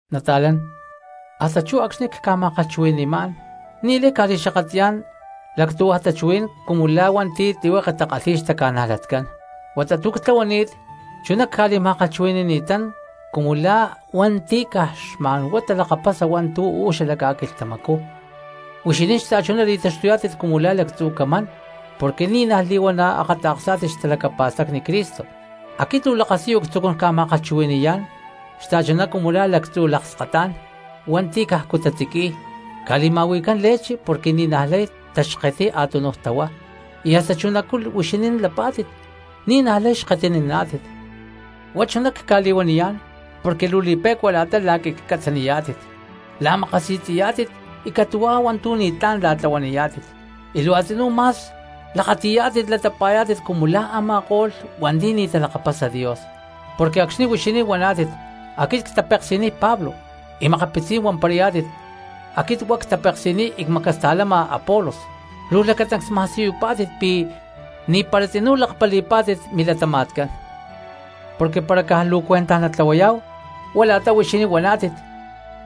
Nata̠lán, hasta chú acxni̠ cca̠ma̠kalhchuhui̠ni̠má̠n ni̠lay cca̠li̠xakatli̠yá̠n lactúhuaj tachuhuí̠n cumu la̠ cristianos hua̠nti̠ tlihueke takalhi̠y xtaca̠najlatcán, huata tu̠ ctlahuani̠t chuná cca̠li̠ma̠kalhchuhui̠ni̠ni̠tán cumu la̠ cristianos hua̠nti̠ caj xma̠nhuá talakapasa hua̠ntu̠ uú xala ca̠quilhtamacú. Huixinín xta̠chuná li̠taxtuyá̠tit cumu la̠ lactzu̠ camán porque ni̠ naj li̠huana̠ a̠ akata̠ksá̠tit xtalacapa̠stacni Cristo. Aquit luu lakasiyu ctzucún ca̠ma̠kalhchui̠ni̠yá̠n xta̠chuná cumu la̠ lactzu̠ lakskatá̠n hua̠nti̠ cajcu tatziqui̠y, ca̠li̠ma̠hui̠cán leche porque ni̠naj lay taxketiy a̠túnuj tahuá; y hasta chunacú huixinín lapá̠tit ni̠ naj lay xketininá̠tit. Huá chuná cca̠li̠huaniyá̠n porque luu li̠pe̠cua la̠ta la̠quiclhcatzaniyá̠tit, la̠makasi̠tzi̠yá̠tit y catu̠huá hua̠ntu̠ ni̠tlá̠n la̠tlahuaniyá̠tit, y luu a̠tzinú ma̠s lakati̠yá̠tit latapa̠yá̠tit cumu la̠ a̠ma̠ko̠lh cristianos hua̠nti̠ ni̠ talakapasa Dios. Porque acxni̠ huixinín huaná̠tit: “Aquit ctapeksi̠niy Pablo”, y makapitzí̠n huamparayá̠tit: “Aquit huá ctapeksi̠niy y cmacasta̠lama Apolos”, luu lacatancs ma̠siyupá̠tit pi̠ ni̠para tzinú lakpali̠pá̠tit milatama̠tcán. Porque para caj luu cuentaj natlahuayá̠hu huá la̠ta huixinín huaná̠tit,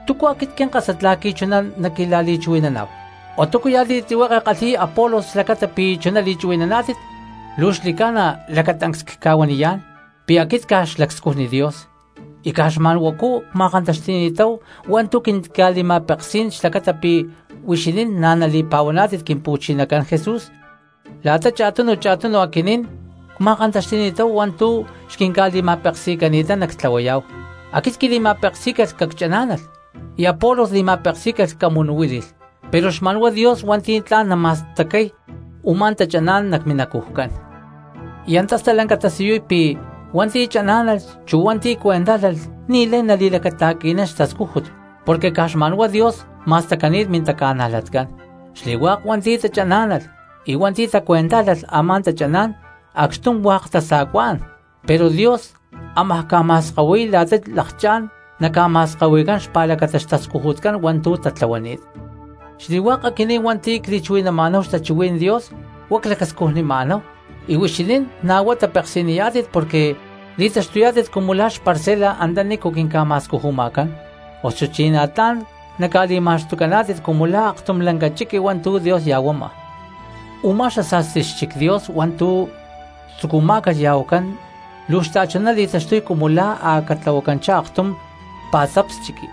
¿túcu aquit quinkásat la̠qui̠ chuná naquila̠li̠chuhui̠naná̠hu? O ¿túcuya̠ li̠tlihueke kalhi̠y Apolos xlacata pi̠ chuná li̠chuhui̠naná̠tit? Luu xli̠ca̠na lacatancs cca̠huaniyá̠n pi̠ aquinín caj xlacscujní̠n Dios, y caj xma̠nhuacú cma̠kantaxti̠ni̠táhu hua̠ntu̠ quintica̠li̠ma̠peksí̠n xlacata pi̠ huixinín na̠ nali̠pa̠huaná̠tit Quimpu̠chinacán Jesús. La̠ta cha̠tunu cha̠tunu aquinín cma̠kantaxti̠ni̠táhu hua̠ntu̠ xquinca̠li̠ma̠peksi̠cani̠tán nactlahuayá̠hu: aquit quili̠ma̠peksí̠calh cacchaná̠nalh, y Apolos li̠ma̠peksí̠calh camunuhuíli̠lh pero xma̠nhuá Dios hua̠nti̠ tla̠n nama̠stacay u̠má tachaná̠n nac minacujcán. Y antá stalanca tasiyuy pi̠ hua̠nti̠ chaná̠nalh, chu hua̠nti̠ cuentájlalh ni̠lay li̠lacata̠qui̠nán xtascújut porque caj xma̠n huá Dios ma̠stacani̠t mintaca̠najlatcán. Xli̠hua̠k hua̠nti̠ tachaná̠nalh y hua̠nti̠ tacuentájlalh a̠má tachaná̠n acxtum hua̠k tasa̠cuá̠n, pero Dios ámaj ca̠ma̠skahui̠y la̠ta lakchá̠n naca̠ma̠skahui̠cán xpa̠lacata xtascujutcán hua̠ntu̠ tatlahuani̠t. Xli̠hua̠k aquinín hua̠nti̠ cli̠chuhui̠naná̠hu xtachuhuí̠n Dios hua̠ clacscujnima̠náhu, y huixinín na̠ huá tapeksi̠niyá̠tit porque li̠taxtuyá̠tit cumu la̠ xparcela antanícu quinca̠ma̠scujuma̠cán, osuchí na̠ tla̠n naca̠li̠ma̠xtucaná̠tit cumu la̠ aktum lanca chiqui hua̠ntu̠ Dios ya̠huama. Umá xasa̠sti xchic Dios hua̠ntu̠ tzucumá̠calh ya̠huacán luu xta̠chuná li̠taxtuy cumu la̠ a̠ catlahuacanchá aktum pa̠tzaps chiqui,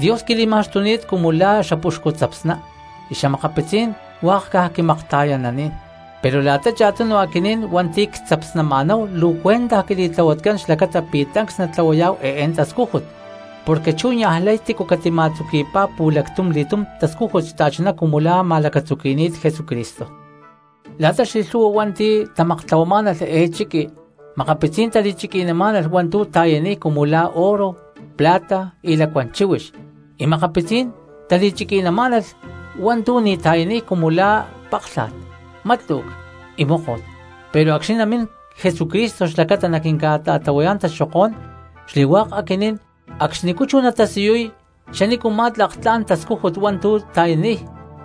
Dios quili̠ma̠xtuni̠t cumu la̠ xapuxcu tzapsná y xa̠makapitzí̠n hua̠k caj quimakta̠yananí̠n, pero la̠ta cha̠tunu aquinín hua̠nti̠ tzapsnama̠náhu luu cuentaj quili̠tlahuatcán xlacata pi̠ tancs natlahuayá̠hu eé tascújut. Porque chú niajlay tícu catima̠lacatzuqui̠pá pu̠lactum li̠túm tascújut xta̠chuná cumu la̠ ma̠lacatzuqui̠ni̠t Jesucristo. La̠ta xli̠lhu̠hua hua̠nti̠ tamaktlahuamá̠nalh eé chiqui makapitzí̠n tali̠chiqui̠namá̠nalh hua̠ntu̠ ta̠yaniy cumu la̠ oro, plata y lacuán chíhuix, y makapitzí̠n tali̠chiqui̠namá̠nalh hua̠ntu̠ ni̠ ta̠yaniy cumu la̠ páklha̠t, mátlu̠c y móko̠t. Pero acxni̠ namín Jesucristo xlacata naquinca̠ta̠tlahuayá̠n taxokó̠n xli̠hua̠k aquinín cristianos acxnicú chú natasiyuy xanícuma̠ tlak tla̠n tascújut hua̠ntu̠ ta̠yaniy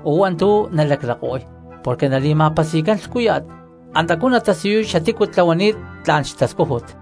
o hua̠ntu̠ nalaclako̠y, porque nali̠ma̠pasi̠cán lhcúya̠t, antacú natasiyuy xatícu tlahuani̠t tla̠n xtascújut.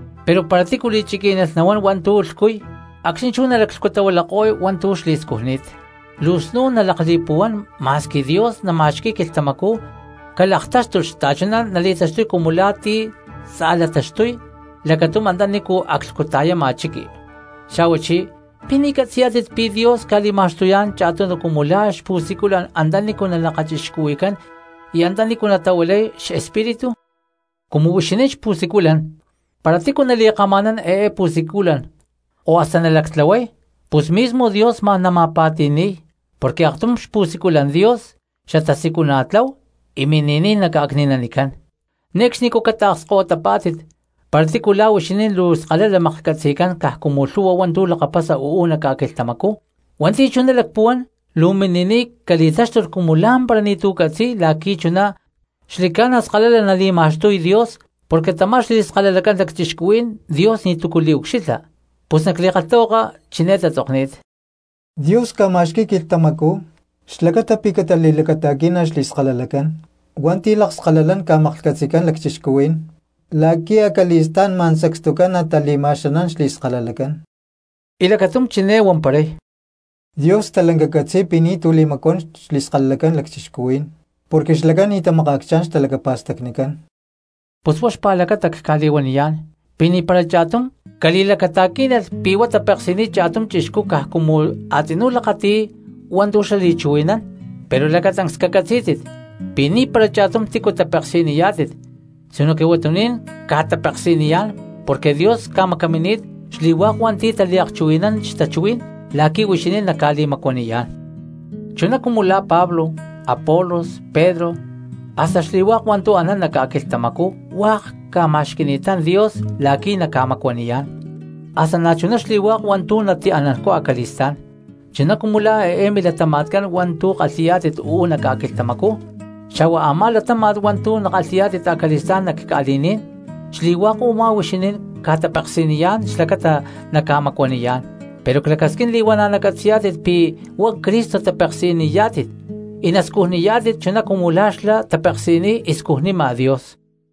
Pero para ti̠ li̠chiquí̠nalh nahuán hua̠ntu̠ lhcuy, acxní chú nalaclhcutahuilako̠y hua̠ntu̠ xli̠scujni̠t, luu snún nalakli̠puhuán ma̠squi Dios nama̠xqui̠y quilhtamacú calaktáxtulh xta̠chuná nali̠taxtuy cumu la̠ ti̠ tza̠lataxtuy lacatum antanícu aclhcuta̠yama chiqui. Xa̠huachí, ¿pi̠ ni̠ catzi̠yá̠tit pi̠ Dios ca̠li̠ma̠xtuyá̠n cha̠tunu cumu la̠ xpu̠siculan antanícu nalakachixcuhui̠cán y na̠ antanícu natahuilay Xespíritu? Cumu huixinín xpu̠siculan, para tícuya̠ cristiano nali̠kama̠nán eé pu̠siculan o hasta nalactlahuay, pus mismo Dios ma̠n nama̠pa̠ti̠ni̠y; porque aktum xpu̠siculan Dios xatasiculana̠tlahu y mini̠níy naca̠cni̠nanicán. Ne̠cxnicú luu cataakskahuítit para tícu la̠ huixinín luu skalala maklhcatzi̠cán caj cumu lhu̠hua hua̠ntu̠ lakapasa uú nac ca̠quilhtamacú, hua̠nti̠ chuná lacpuhuán luu mini̠niy cali̠táxtulh cumu lá̠mpara ni̠tu̠ catzi̠y la̠qui̠ chuná xli̠ca̠na skalala nali̠ma̠xtuy Dios. Porque tamá xli̠skalalacán lacchixcuhuí̠n Dios ni̠túcu liucxilha. Pus nac li̠kalhtahuaka chiné tatzokni̠t: “Dios ca̠ma̠xqui̠y quilhtamacú xlacata pi̠ catali̠lacata̠quí̠nalh xli̠skalalacán hua̠nti̠ lakskalalán ca̠maklhcatzi̠cán lacchixcuhuí̠n la̠qui̠ acali̠stá̠n ma̠n sacstucán natali̠tama̠xani̠y xli̠skalalacán.” Y lacatum chiné huamparay: “Dios stalanca catzi̠y pi̠ ni̠tu̠ li̠macuán xli̠skalalacán lacchixcuhuí̠n porque xlacán ni̠ tamakaacchá̠n xtalacapa̠stacnicán.” Pus huá xpa̠lacata cca̠li̠huaniyá̠n pi̠ ni̠para cha̠tum cristiano cali̠lacata̠quí̠nalh pi̠ huá tapeksi̠niy cha̠tum chixcú caj cumu a̠tzinú lakati̠y hua̠ntu̠ xlá li̠chuhui̠nán. Pero lacatancs cacatzí̠tit pi̠ ni̠para cha̠tum tícu tapeksi̠niyá̠tit sinoque huatuní̠n ca̠tapeksi̠niyá̠n porque Dios ca̠macamini̠t xli̠hua̠k hua̠nti̠ taliakchuhui̠nán xtachuhuí̠n la̠qui̠ huixinín naca̠li̠macuaniyá̠n. Chuná cumu la̠ Pablo, Apolos, Pedro, hasta xli̠hua̠k hua̠ntu̠ anán nac ca̠quilhtamacú hua̠k ca̠ma̠xqui̠ni̠tán Dios la̠qui̠ naca̠macuaniyá̠n, hasta na̠chuná xli̠hua̠k hua̠ntu̠ natianancú acali̠stá̠n, chuná cumu la̠ eé milatama̠tcán hua̠ntu̠ kalhi̠yá̠tit uú nac ca̠quilhtamacú, xa̠hua a̠má latáma̠t hua̠ntu̠ nakalhi̠yá̠tit acali̠stá̠n nac ca̠li̠ní̠n, xli̠hua̠k u̠má huixinín ca̠tapeksi̠niyá̠n xlacata naca̠macuaniyá̠n. Pero clacasquín li̠huana̠ nacatzi̠yá̠tit pi̠ huá Cristo tapeksi̠niyá̠tit y nascujnaniyá̠tit chuná cumu la̠ xlá tapeksi̠niy y scujnima Dios.